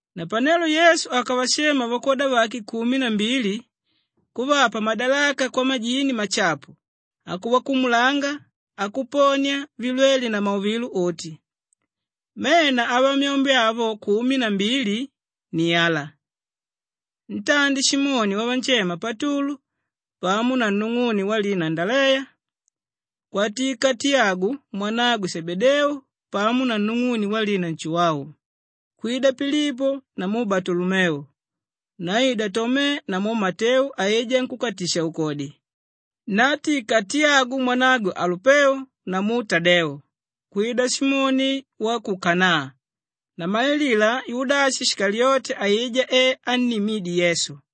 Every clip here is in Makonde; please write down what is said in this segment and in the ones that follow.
Napanelo Yesu akavashema vakwoda vake kumi na mbili kuvapa madalaka kwamajini mashapu, akuvakumulanga, akuponia vilwele na mauvilo uti. Mena avamyombe avo kumi na mbili ni ala: ntandi, Simoni wavanshema Patulu pamo na nung'une walina Andaleya, kwatika Tiyagu mwanagwe Shebedeu pamo na nung'une walina Nshuwau, kwida Pilipo namu Balutolomeu, naida Tome namu Mateu aijá nkúkatisha-ukodi, naatika Tiyagu mwanagwe Alupeu namu Tadeu, kwida Simoni wa ku Kanaa, namalilila Yudashi Shikaliyote aijá e annimídye Yesu.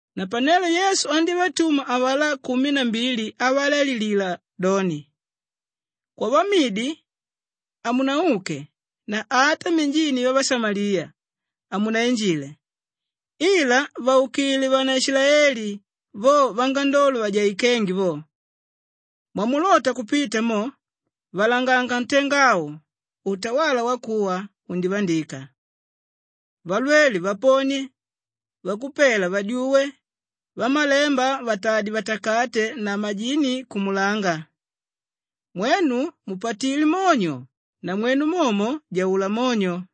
Napanelo Yesu andívatuma avalá kumi na mbili avalaililila doni, “Kwavamidi, hamunauke na ata minjini vyavashamaliya, hamunainjile ila vaukile vanaishilaeli, vo vangandolo vajaikénge vo. Mwamulota kupita mo, valanganga ntenga au, ‘Utawala wakuwa undivandika.’ Valwele vaponie, vakupela vadyuwe, vamalemba vatadye vatakate na majini kumulanga. Mwenu mupatilé monyo, namwenu momo jaula monyo.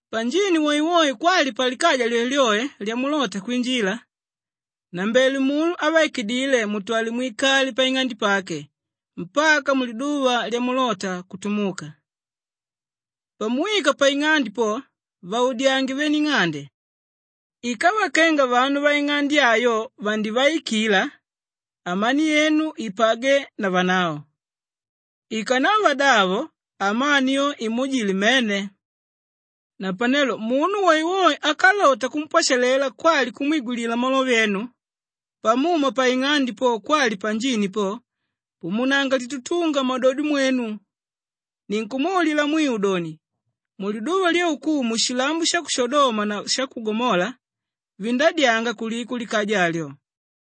“Panjini woewoe kwali palikaja lyoelyoe lyamulota kwinjila, nnambele munu ávaikidile mutwale mwikale paing'ande pake mpaka muliduva lyamulota kutumuka. Pamuwika paing'ande po, vaudyange vene ing'ande. Ikava kenga vanu vaing'ande ayo vandivaikila, amani yenu ipagwe na vanavo. Ikanava davo, amani yo imuujile mmene. Napanelo munu woewoe ákalota kumpwashalela kwali kumwigwilila malove enu, pamuma paing'ande po kwali panjini po, pumunanga litutunga mmadodo mwenu. Ninkumwaulila mwiu doni, muliduva lyaukumu shilambo sha ku Shodoma na sha ku Gomola vindadyanga kuliko likaja alyo.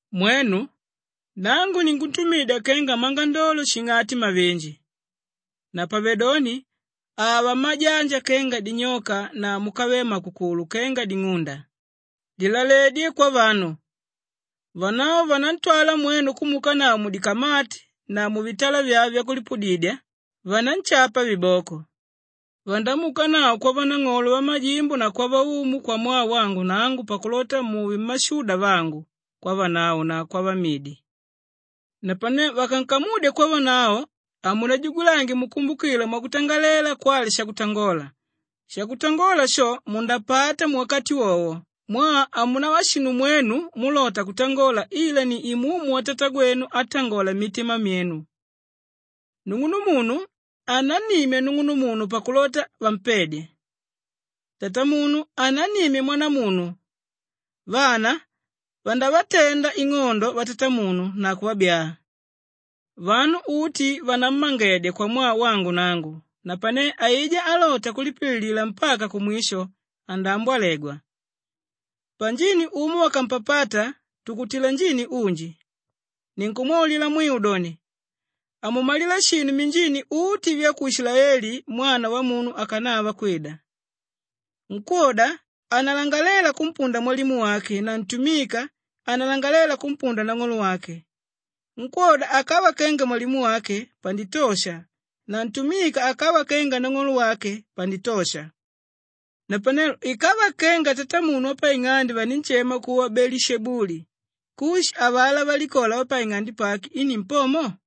“Mwenu, nangu ninkuntumidya kenga mmangandolo shing'ati mavinji. Napavedoni ava mmajanja kenga dinyoka na múkavele makukulu kenga ding'unda. Lilaledye kwavanu. Vanavo vanantwala mwenu kumuukanavo mudikamati na muvitala vyave vyakulipudidya, vananshapa viboko. Vandamuukanavo kwavanang'olo vamajimbo na kwavaumu kwamwaa wangu nangu pakulota muve mmashuda vangu kwavanavo na kwavamidi. Napane vakankamudya kwavanavo, hamunajugulange mukumbukila mwakutangalela kwali shakutangola. Shakutangola sho, mundapata muwakati wowo mwaa hamunava shinu mwenu múlota kutangola ila ni Imumu watatagwenu átangola mmitima myenu. “Nung'unumunu anannimya nung'unumunu pakulota vampedye. Tatamunu anannimya mwanamunu. Vana vandavatenda ing'ondo vatatamunu na kuvabyaa. Vanu uti vanammangedya kwamwaa wangu nangu napane aijá álota kulipililila mpaka kumwisho andaambwalegwa. Panjini umo vakampapata tukutila njini unji. Ninkumwaulila mwiu doni, hamumalila shinu minjini uti vya ku Ishilaeli Mwana Wamunu ákanava kwida. “Nkwóda hanalangalela kumpunda mwalimu wake na ntumika hanalangalela kumpunda nang'olo wake. Nkwóda akava kenga mwalimu wake panditosha na ntumika akava kenga nang'olo wake panditosha. Napanelo ikava kenga tatamunu wapaing'ande vaninshema kuva Beelishebuli, kushi avalá valikola vapaing'ande pake i nimpomo?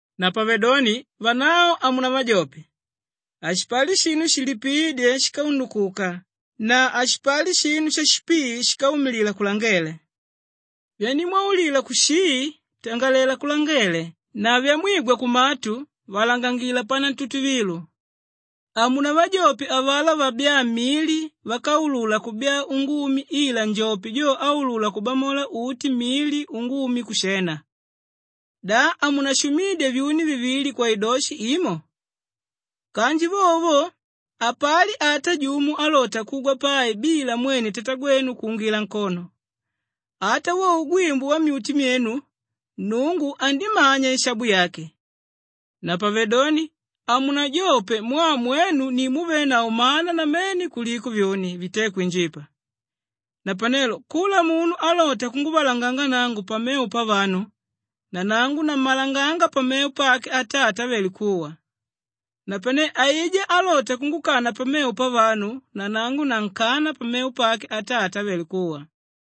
“Napavedoni vanavo hamunavajope. Hashipali shinu shilipiídye shíkaundukuka na hashipali shinu shashipii shíkaumilila kulangele. Vyandimwaulila kushii tangalela kulangele na vyamwigwa kumatu valangangila panantutuvilo. Hamunavajope avalá vabyáa mili vákaulula kubyaa ungumi ila njope jo áulula kubamola uti mili ungumi kushena. Da hamunashumidya vyuni vivili kwaidoshi imo? Kanji vovo vo hapali ata jumo álota kugwa pai bila mwene Tatagwenu kuungila nkono. Ata wo ugwimbu wammyuti vyenu Nnungu andimanya ishabu yake. Napavedoni hamunajope mwaa mwenu ni múvenavo mana namene kuliko vyuni vité kwinjipa. “Napanelo kula munu álota kunguvalanganga nangu pamevo pavanu, nanangu nammalanganga pamevo pake Atata ávele kuwa. Napane aijá álota kungukana pamevo pavanu nanangu nankana pamevo pake Atata ávele kuwa.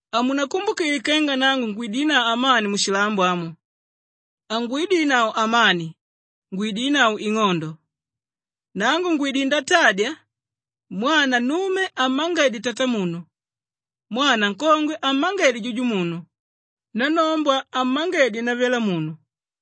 “Hamunakumbukile kenga nangu ngwidinavo amani mushilambo amu. Hangwidinavo amani, ngwidinavo ing'ondo. Nangu ngwidilé ndatadya, “ ‘Mwana nnume ammangedye tatamunu, mwana nkongwe ammangedye jujumunu, nannombwa ammangedye navyalamunu.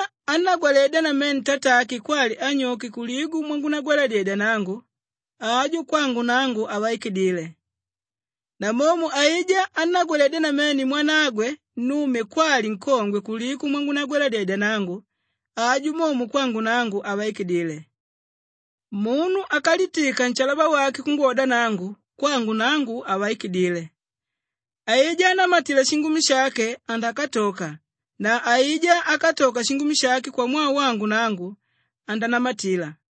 “Aijá ánnagwaledya namene tatake kwali anyoke kuliko mwangunagwaladyedya nangu, ajo kwangu nangu havaikidile. Namomo aijá ánnagwaledya namene mwanagwe nnume kwali nkongwe kuliko mwangunagwaladyedya nangu, ajo momo kwangu nangu, havaikidile. Munu ákalitika nshalaba wake kungwoda nangu, kwangu nangu havaikidile. Aijá ánamatila shingumi shake andakatoka na aijá ákatoka shingumi shake kwamwaa wangu nangu andanamatila.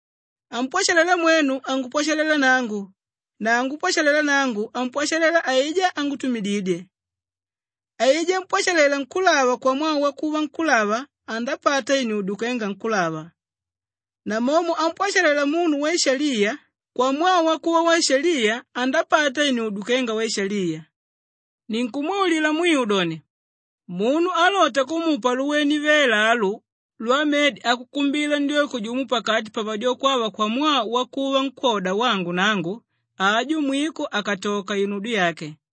“Ámpwashalela mwenu, angupwashalela nangu na ángupwashalela nangu, ampwashalela aijá ángutumididye. Aijá ámpwashalela nkúlava kwamwaa wakuva nkúlava andapata inudyo kenga nkúlava. Namomo ámpwashalela munu waishaliya kwamwaa wakuva waishaliya andapata inudyo kenga waishaliya. Ninkumwaulila mwiu doni, munu álota kumupa luwene vela alu lwamedi akukumbila ndyoko jumo pakati pavadyoko ava kwamwaa wakuva nkwóda wangu nangu, ajo mwiko hakatoka inudyo yake.”